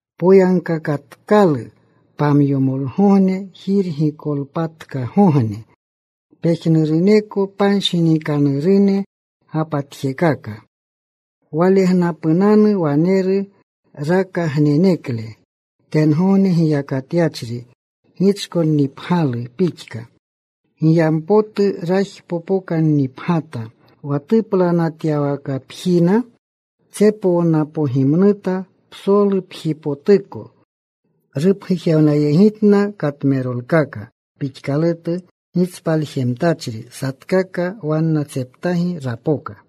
Poyagkakatkalu pamyomolegogne, Jirgikolpatkagogne. Pejnuruneko panshinikanurune gapatjekaka. Walegnapunanu waneru rakagnenekle tengogne giyakatyachri gichkonnipgyalu pixka. Giyampotu rajpokokannipgyata. Wa tuplanatyawakapjina tsepownapogimnuta psolupjipotuko. Rupgujewnayegitna katmerolkaka pixkalutu gitspaljemtachri. Satkaka wannatseptagi rapoka.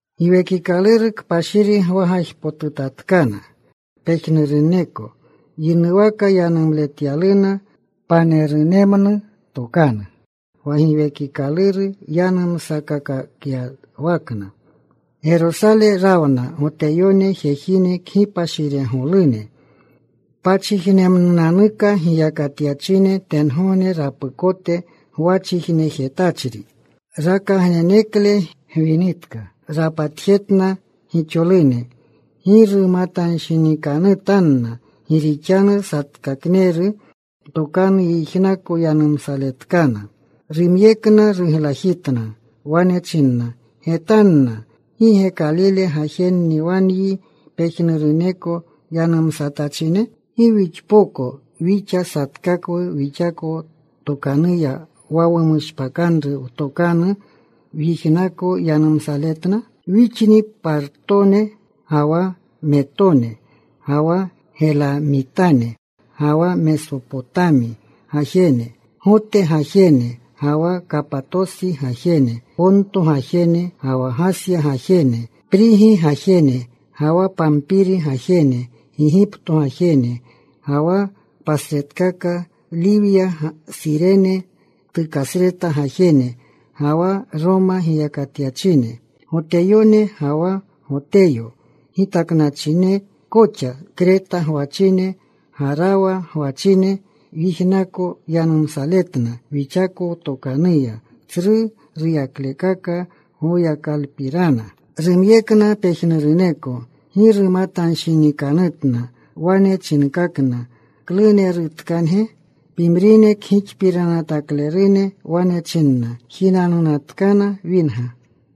Giwekikaluru Kpashiri gwagajpotutatkana pejnuruneko. Yinuwaka yanumletyaluna panerunemnu tokanu wa Giwekikaluru yanumsakakyawakna. Gerosale rawna Goteyone jejine kgipashiregolune, pachijnemnunanuka giyakatyachine tengogne rapukote gwachijnejetachri. Rakagnenekle gwinitka rapatjetna gixolune. Gi rumatanshinikanutanna gi rixanu satkakneru tokanu yijnako yanumsaletkana. Rumyekna. Ruglajitna. Wane chinna, “Getanna. ¿Gi ge Kalile gajenni wa nyi pejnuruneko yanumsatachine? ¿Gi wixpoko wixa satkakwu wixako tokanuya wa wumushpakanru wtokanu wyijnako yanumletna? Wixni Partone, ga wa Metone, ga wa Gelamitane, ga wa Mesopotami gajene, Gote gajene, ga wa Kapatosi gajene, Ponto gajene, ga wa Gasya gajene. Prigi gajene, ga wa Pampiri gajene, Gigipto gajene, ga wa pasretkaka Liwya, Surene tukasreta gajene, ga wa Roma giyakatyachine, Goteyone ga wa Goteyo gitaknawachine koxa. Krete gwachine, Garawa gwachine, wyijnako yanumsaletna wixako wtokanuya tsru ruyaklekaka Goyakalupirana.” Rumyekna pejnuruneko. Gi rumatanshinikanutna. Wane chinkakna, “¿Klunerutkange?” Pimrine kgixpiranataklerune. Wane chinna, “Jinanunatkana winga.”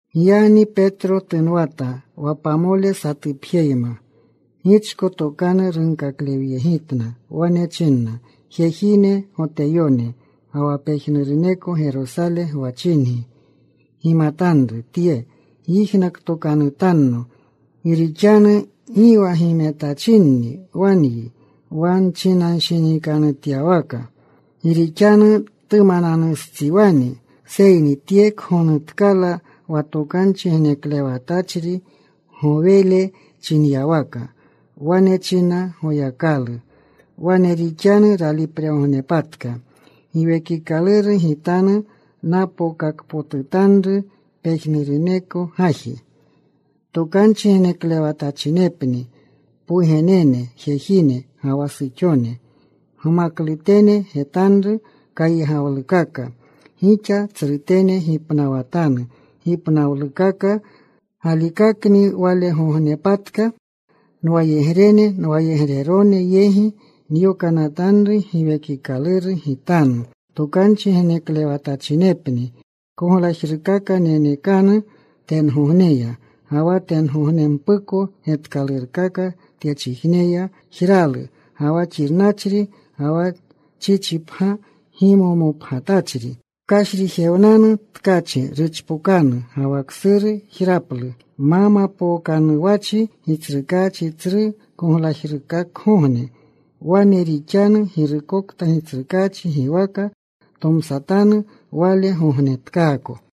Giyagni Petro tunwata wa pamole satupjeneyma. Gichko tokanru runkaklewyegitna. Wane chinna, “Jejine, Goteyone, ga wa pejnuruneko Gerosale gwachingi, gimatanru tye. Gyijnakotokanutanno. Gi rixanu gi wa gimetachinni wa nyi wa nchinanshinikanutyawaka. Gi rixanu tumananustsiwani. Seyni tye kgonutkala wa tokanchi geneklewatachri Gowele chinyawaka: Wane china Goyakalu: Wane rixanu ralipregognepatka. Giwekikaluru Gitanu napookakpotutanru pejnuruneko gaji. Tokanchi geneklewatachinepni pwugenene jejine ga wa suxone. Gmaklutene getanru kaygawlukaka. Gixa tsrutene gipnawatanu gipnawlukaka. Galikakni walgognepatka nwayegrene, nwayegrerone yegi nyokanatanru Giwekikaluru Gitanu. Tokanchi geneklewatachinepni. Koglajrukaka nenekanu tengogneya, ga wa tengognempuko getkalurkaka tyechijneya, jralu, ga wa xirnachri, ga wa chichipgya gimomopgyatachri. Kashrijewnanu tkachi. Ruchpokanu. Ga wa ksuru jraplu, ma mapookanuwachi Gitsrukaachi tsru koglajrugogne. Wane rixanu girukokta Gitsrukaachi giwaka tomsatanu, wale gognetkaako.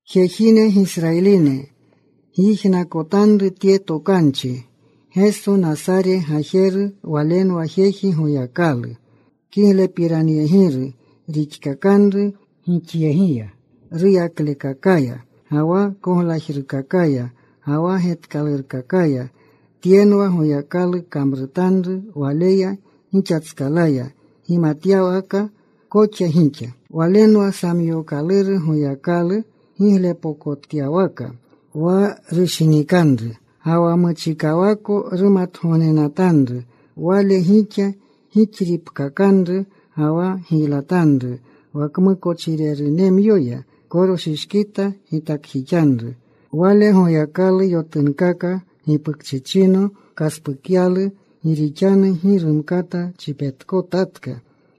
“Jejine, Gisrayiline gyijnakotanru tye tokanchi: Geso, Nasare gajeru, Walenwa jeji Goyakalu kiglepiranyegiru rixkakanru gixyegiya ruyaklekakaya, ga wa koglajrekakaya, ga wa getkalurkakaya. Tyenwa Goyakalu kamrutanru Waleya gixatskalaya, gimatyawaka koxa gixa. Walenwa samyookaluru Goyakalu giglepokotyawaka wa rushinikanru, ga wa muchikawako rumatgognenatanru. Wale gixa gixripkakanru ga wa giylatanru wa kmukochirerunemyoya. Koroshishkita gitakjixanru. Wale Goyakalu yotunkaka. Gipukchichino kaspukyalu. Gi rixanu gi rumkata chipetkotatka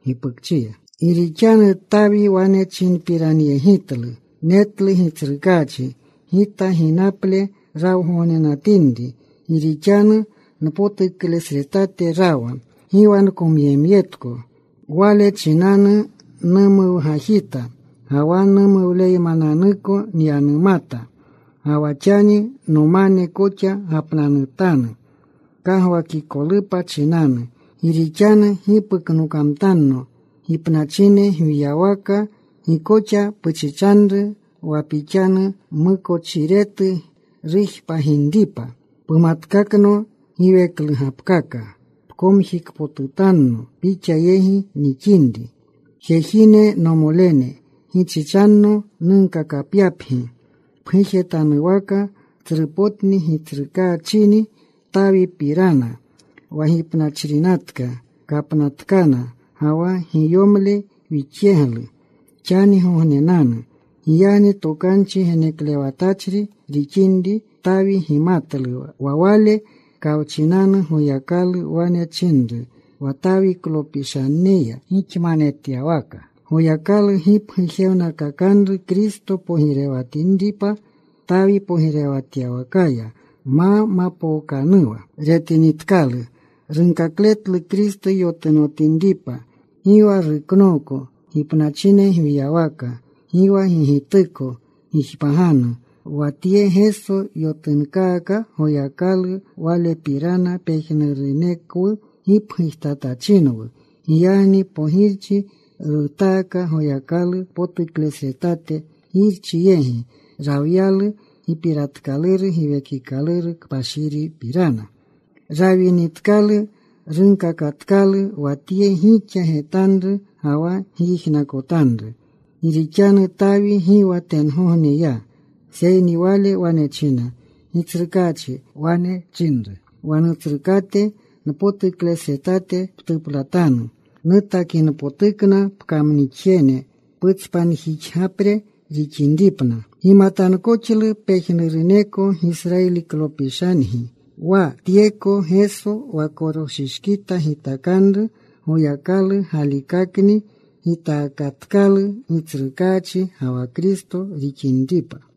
gipukchiya. “Gi rixanu Tawi wane chinpiranyegitlu: Netlu Gitsrukaachi gita ginaple rawgognenatinri. Gi rixanu npotuklesretate rawa, Gi wa nkomyemyetko. Wale chinanu numuwgajita, ga wa numuwleymananuka nyanumata. Ga wa xani nomane koxa gapnanutanu kagwakikolupa chinanu. Gi rixanu gi puknokamtanno gipnachine gwiyawaka. Gi koxa puchichanru wa Pixanu mmukochiretu rujpaginripa. Pumatkakno giweklugapkaka. Pomjikpotutanno Pixa yegi nixinri. “Jejine, nomolene, gichichanno nunkakyapgi pgujetanuwaka tsrupotni gitsrukaachini Tawipirana. Wa gipnachrinatka. Kapnatkana. Ga wa giyomle wixyeglu xanigognenanu. Giyagni tokanchi geneklewatachri rixinri, Tawi gimatlu wa Wale kawchinanu Goyakalu wane chinru wa Tawiklopishaneya gixmanetyawaka Goyakalu gipgujewnakakanru Kristo pogirewatinripa Tawi pogirewatyawakaya. Ma mapookanuwa retinitkalu, runkakletlu Kristo yotunotinripa. Gi wa ruknooko gipnachine gwiyawaka. Gi wa gigituko jpaggianu Wa tye Geso yotunkaka Goyakalu. Walepirana pejnurunekwu gipgujtatachinwu. Giyagni pogirchi rutaaka Goyakalu potuklesretate. Girchi yegi rawyalu gipiratkaluru Giwekikaluru Kpashiripirana. Rawinitkalu rupkakatkalu wa tye gixa getanru ga wa gyijnakotanru. Gi rixanu Tawi gi wa tengogne ya, seyni wale wane china: Gitsrukaachi wane chinru wa Nutsrukate, Npotuklesretate ptuplatanu, Nutakinpotukna pkamnixjene putspanjixgapre rixinripna. “Gimatankoxlu pejnuruneko Gisrayiliklopishangi wa tyeko Geso wa koroshishkita gitakanru, Goyakalu galikakni gitakatkalu Gitsrukaachi ga wa Kristo rixinripa.”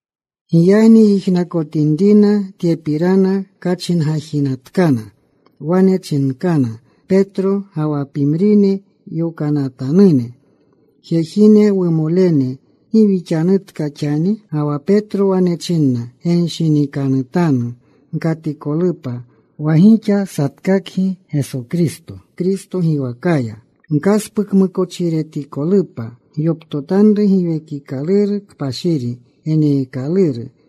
Giyagni yijnakotinrina tyepirana, kachingajinatkana. Wane chinkana Petro ga wa pimrine yokanatanune, “Jejine, wumolene, ¿gi wixanutka xani?” Ga wa Petro wane chinna, “Genshinikanutanu. Gkatikolupa wa gixa satkakgi Geso Kristo giwakaya, gkaspukmukochiretikolupa. Gyoptotanru Giwekikaluru Kpashiri geneekaluru.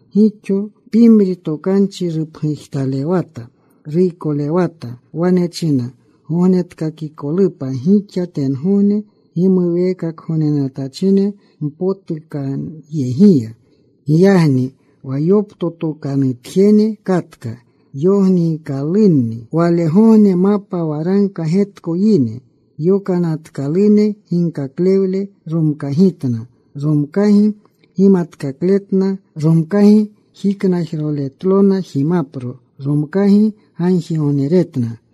Gixo pimri tokanchi rupgujtalewata. Ruykolewata. Wane china, “Gognetkakikolupa gixa tyegogne gimuweekakanatachine mpotukanyegiya.” Giyagni wa yoptotokanutjene katka. Yogniikalunni walegogne mapa waragka getko yine. Yokanatkalune ginkaklewle romkagitna. Romkagi gimatkakletna. Romkagi jiknajroletlona jimapro. Romkagi gagjigogneretna.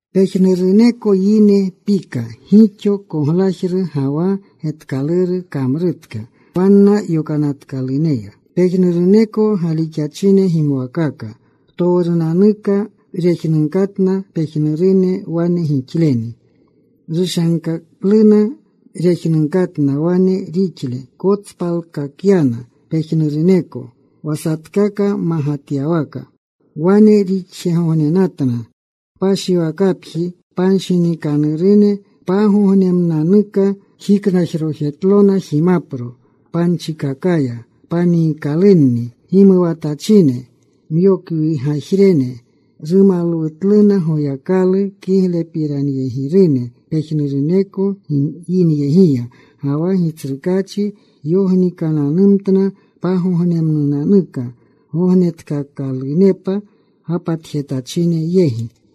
Pejnuruneko yine pika. Gixo koglajru ga wa getkaluru kamrutka wanna yokanatkaluneya. Pejnuruneko galixachine gimwakaka. Ptowrunanuka rejnunkatna pejnurune wane gixleni. Rushankaluna rejnunkatna, wane rixlena. Kotspalkakyana pejnuruneko wa satkaka magatyawaka. Wane rixjegognenatna kpashiwakapjiya panshinikanurune pagognemnunanuka. Jiknajrojetlona jimapro panchikakaya. Paniikalunni gimuwatachine, myokwirgajine. Rumalwutluna Goyakalu. Kiglepiranyegirune pejnuruneko yinyegiya, ga wa Gitsrukaachi yognikananumtna pagognemnunanuka gognetkaakalunepa gapatjetachine yegi.